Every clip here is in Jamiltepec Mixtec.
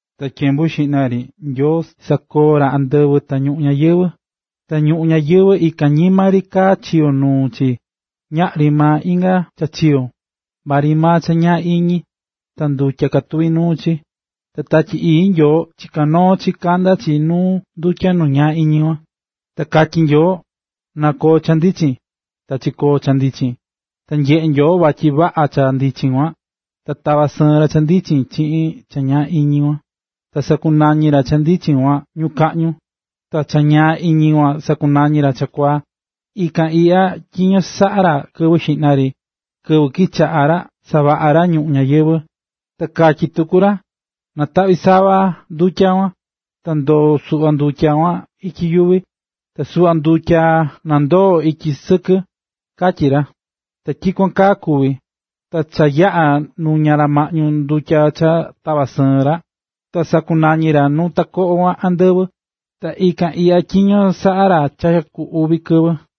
Ta tyembu xiꞌna ri Nyoo sakoo̱ ra andɨvɨ ta ñuꞌún ñayɨvɨ̱. Ta ñuꞌún ñayɨvɨ̱ ikan ñima ri kaá chiyo̱ nuu chi, ta ñaꞌri maa inga cha chiyo̱, maa ri maa cha ñaa iñi, ta ndutya katuví nuu chi. Ta Tatyi Ii Nyoo chiká noo chi kandá chi nu ndutya nu ñaa iñi kuan. Ta katyí Nyoo: “¡Na koo cha ndichin!” Ta chikoo̱ cha ndichin. Ta nyeꞌe̱ Nyoo vatyi vaꞌa cha ndichin kuan, ta tava̱ sɨɨn ra cha ndichin chiꞌin cha ñaa iñi kuan. Ta sakunañi̱ ra cha ndichin kuan “ñukaꞌñu”, ta cha ñaa iñi kuan sakunañi̱ ra “chakuaa”. Ta ikan iꞌya tyiño saꞌa̱ ra kɨvɨ xiꞌna ri, kɨvɨ kichaꞌa̱ ra savaꞌa ra ñuꞌún ñayɨvɨ̱. Ta katyí tuku ra: “Na̱taꞌvi sava ndutya kuan, na ndoo suꞌva ndutya kuan ityi yuvi, ta suꞌva ndutya na ndoo ityi sɨkɨ”, katyí ra. Ta tyikuan kaa kuvi̱. Ta cha yaꞌa̱ nuña̱ maꞌñu ndutya cha tava̱ sɨɨn ra, ta sakunañi̱ ra nu takoꞌo kuan “andɨvɨ”. Ta ikan iꞌya tyiño saꞌa̱ ra cha ku uvi kɨvɨ.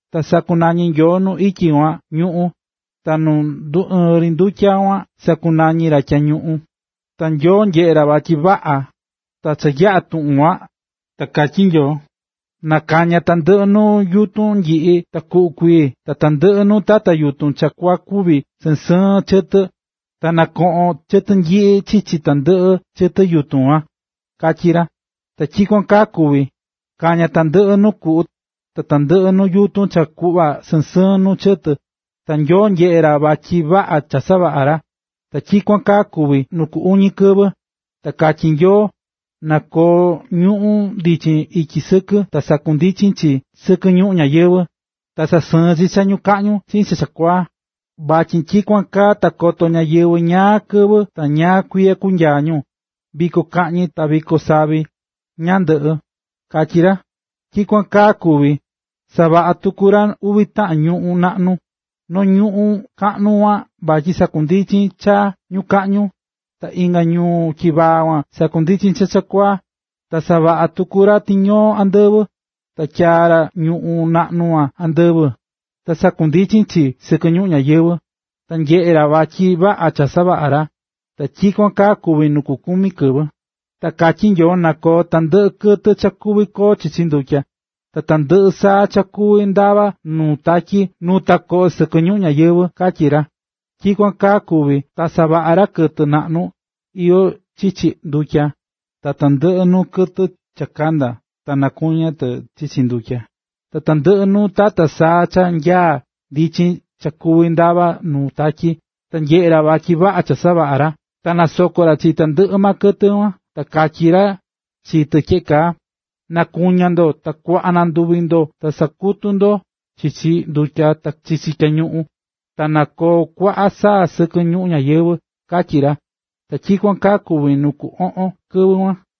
Ta sakunañi̱ Nyoo nu ityi kuan “ñuꞌún”, ta nu nduɨɨ̱n ri ndutya kuan sakunañi̱ ra “tyañuꞌun”. Ta Nyoo nyeꞌe̱ ra vatyi vaꞌa. Ta cha yaꞌa̱ tuꞌun kuan, ta katyí Nyoo: “Na kaña tandɨꞌɨ nuu yutun nyiꞌi ta kuꞌu kuii ta tandɨꞌɨ nuu tata yutun cha kua kuꞌva sɨɨn sɨɨn chɨtɨ, ta na koꞌon chɨtɨ nyiꞌi chichi tandɨꞌɨ chɨtɨ yutun kuan”, katyí ra. Ta tyikuan kaa kuvi̱. Kaña̱ tandɨꞌɨ nuu kuꞌu, tandɨꞌɨ nuu yutun cha kuꞌva sɨɨn sɨɨn nuu chɨtɨ. Ta Nyoo nyeꞌe̱ ra vatyi vaꞌa cha savaꞌa̱ ra. Ta tyikuan kaa kuvi̱ nuu ku uñi kɨvɨ. Ta katyí Nyoo: “Na koo ñuꞌu̱n ndichin ityi sɨkɨ ta sandundichin chi sɨkɨ ñuꞌún ñayɨvɨ̱, ta sasɨɨn chi cha ñukaꞌñu chiꞌin cha chakuaa, vatyi tyikuan kaa ta koto ñáyɨvɨ ñaa kɨvɨ ta ñaa kuiya kunyaa ñu, viko kaꞌñi ta viko savi ñandɨꞌɨ”, katyí ra. Ta tyikuan kaa kuvi̱. Savaꞌa̱ tuku ra uvi taꞌan ñuꞌu̱n naꞌnu: noo ñuꞌu̱n kaꞌnu kuan vatyi sandundichin cha ñukaꞌñu, ta inga ñuꞌu̱n tyivaa kuan sandundichin cha chakuaa. Ta savaꞌa̱ tuku ra tiñoo andɨvɨ. Ta tyaa̱ ra ñuꞌu̱n naꞌnu kuan andɨvɨ, na sandundichin chi sɨkɨ ñuꞌún ñayɨvɨ̱. Ta nyeꞌe̱ ra vatyi vaꞌa cha savaꞌa̱ ra. Ta tyikuan kaa kuvi̱ nu ku kumi kɨvɨ. Ta katyí Nyoo: “Na koo tandɨꞌɨ kɨtɨ cha kuvi koo chichi ndutya, ta tandɨꞌɨ saa cha kuvi ndava nu tatyi nu takoꞌo sɨkɨ ñuꞌún ñayɨvɨ̱”, katyí ra. Ta tyikuan kaa kuvi̱. Ta savaꞌa̱ ra kɨtɨ naꞌnu iyó chichi ndutya, ta tandɨꞌɨ nuu kɨtɨ cha kandá ta nakuñá tɨ chichi ndutya, ta tandɨꞌɨ nuu tata saa cha nyaá ndichin cha kuví ndavá nuu tatyi. Ta nyeꞌe̱ ra, vatyi vaꞌa cha savaꞌa̱ ra. Ta nasoko̱ ra chi tandɨꞌɨ maa kɨtɨ kuan, ta katyí ra chi tɨ tyeꞌe kaa: “Na kuña ndo, ta kuaꞌa na nduvi ndo, ta sa̱kutu ndo chichi ndutya, ta chichi tyañuꞌun. Ta na koo kuaꞌa saa sɨkɨ ñuꞌún ñayɨvɨ̱”, katyí ra. Ta tyikuan kaa kuvi̱ nu ku oꞌon kɨvɨ kuan.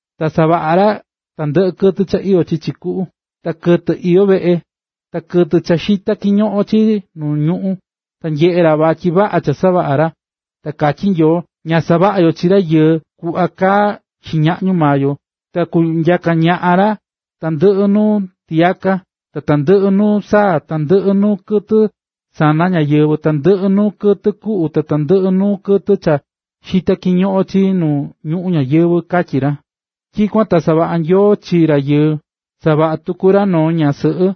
Ta savaꞌa̱ ra tandɨꞌɨ nuu kɨtɨ cha iyó chichi kuꞌu, ta kɨtɨ iyó veꞌe, ta kɨtɨ cha xitá kiñoꞌon chii nu ñuꞌún. Ta nyeꞌe̱ ra vatyi vaꞌa cha savaꞌa̱ ra. Ta katyí Nyoo: “Na savaꞌa yo chi rayɨɨ tari kuꞌva kaá xiñaꞌñu maa yo, ta kunyaka ñaꞌan ra tandɨꞌɨ nuu tiyaka, ta tandɨꞌɨ nuu saa, tandɨꞌɨ nuu kɨtɨ sana ñáyɨvɨ, tandɨꞌɨ nuu kɨtɨ kuꞌu, ta tandɨꞌɨ nuu kɨtɨ cha xitá kiñoꞌon chii nu ñuꞌún ñayɨvɨ̱”, katyí ra. Tyikuan ta savaꞌa̱ Nyoo chi rayɨɨ. Savaꞌa̱ tuku ra noo ñaꞌan sɨꞌɨ.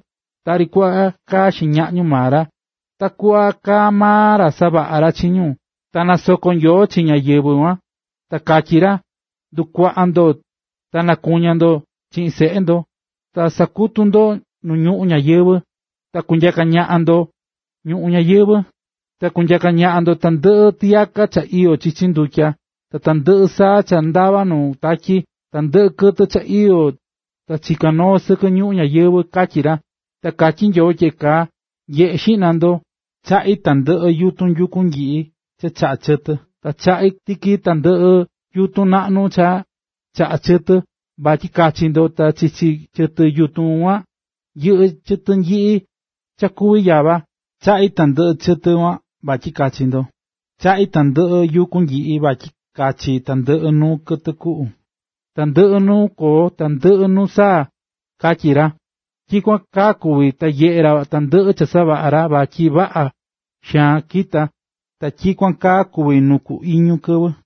Tari kuꞌva kaá xiñaꞌñu maa ra, takuꞌva kaa maa ra savaꞌa̱ ra chi ñu. Ta nasoko̱ Nyoo chi ñáyɨvɨ kuan, ta katyí ra: “Na ndukuaꞌa ndo, ta nakuña ndo chiꞌin seꞌe ndo, ta sa̱kutu ndo nuu ñuꞌún ñayɨvɨ̱ ta kunyaka ñaꞌan ndo ñuꞌún ñayɨvɨ̱. Ta kunyaka ñaꞌan ndo tandɨꞌɨ tiyaka cha iyó chichi ndutya, ta tandɨꞌɨ saa cha ndavá nuu tatyi, ta tandɨꞌɨ kɨtɨ cha iyó ta chiká noo sɨkɨ ñuꞌún ñayɨvɨ̱”, katyí ra. Ta katyí Nyoo tyeꞌe kaa: “Nye̱ꞌe xiꞌna ndo, chaꞌí tandɨꞌɨ yutun yuku nyiꞌi cha chaꞌá chɨtɨ, ta chaꞌá tiki tandɨꞌɨ yutun naꞌnu cha chaꞌá chɨtɨ, vatyi kachi ndo, ta chichi chɨtɨ yutun kuan yɨꞌɨ́ chɨtɨ nyiꞌi cha kuví yava. Chaꞌí tandɨꞌɨ chɨtɨ kuan vatyi kachi ndo. Ta chaꞌí tandɨꞌɨ yuku nyiꞌi vatyi kachi tandɨꞌɨ nuu kɨtɨ kuꞌu, ta tandɨꞌɨ nuu koo, ta tandɨꞌɨ nuu saa”, katyí ra. Ta tyikuan kaa kuvi̱. Ta nyeꞌe̱ ra tandɨꞌɨ cha savaꞌa̱ ra, vatyi vaꞌa xaan kita̱. Ta tyikuan kaa kuvi̱ nu ku iñu kɨvɨ.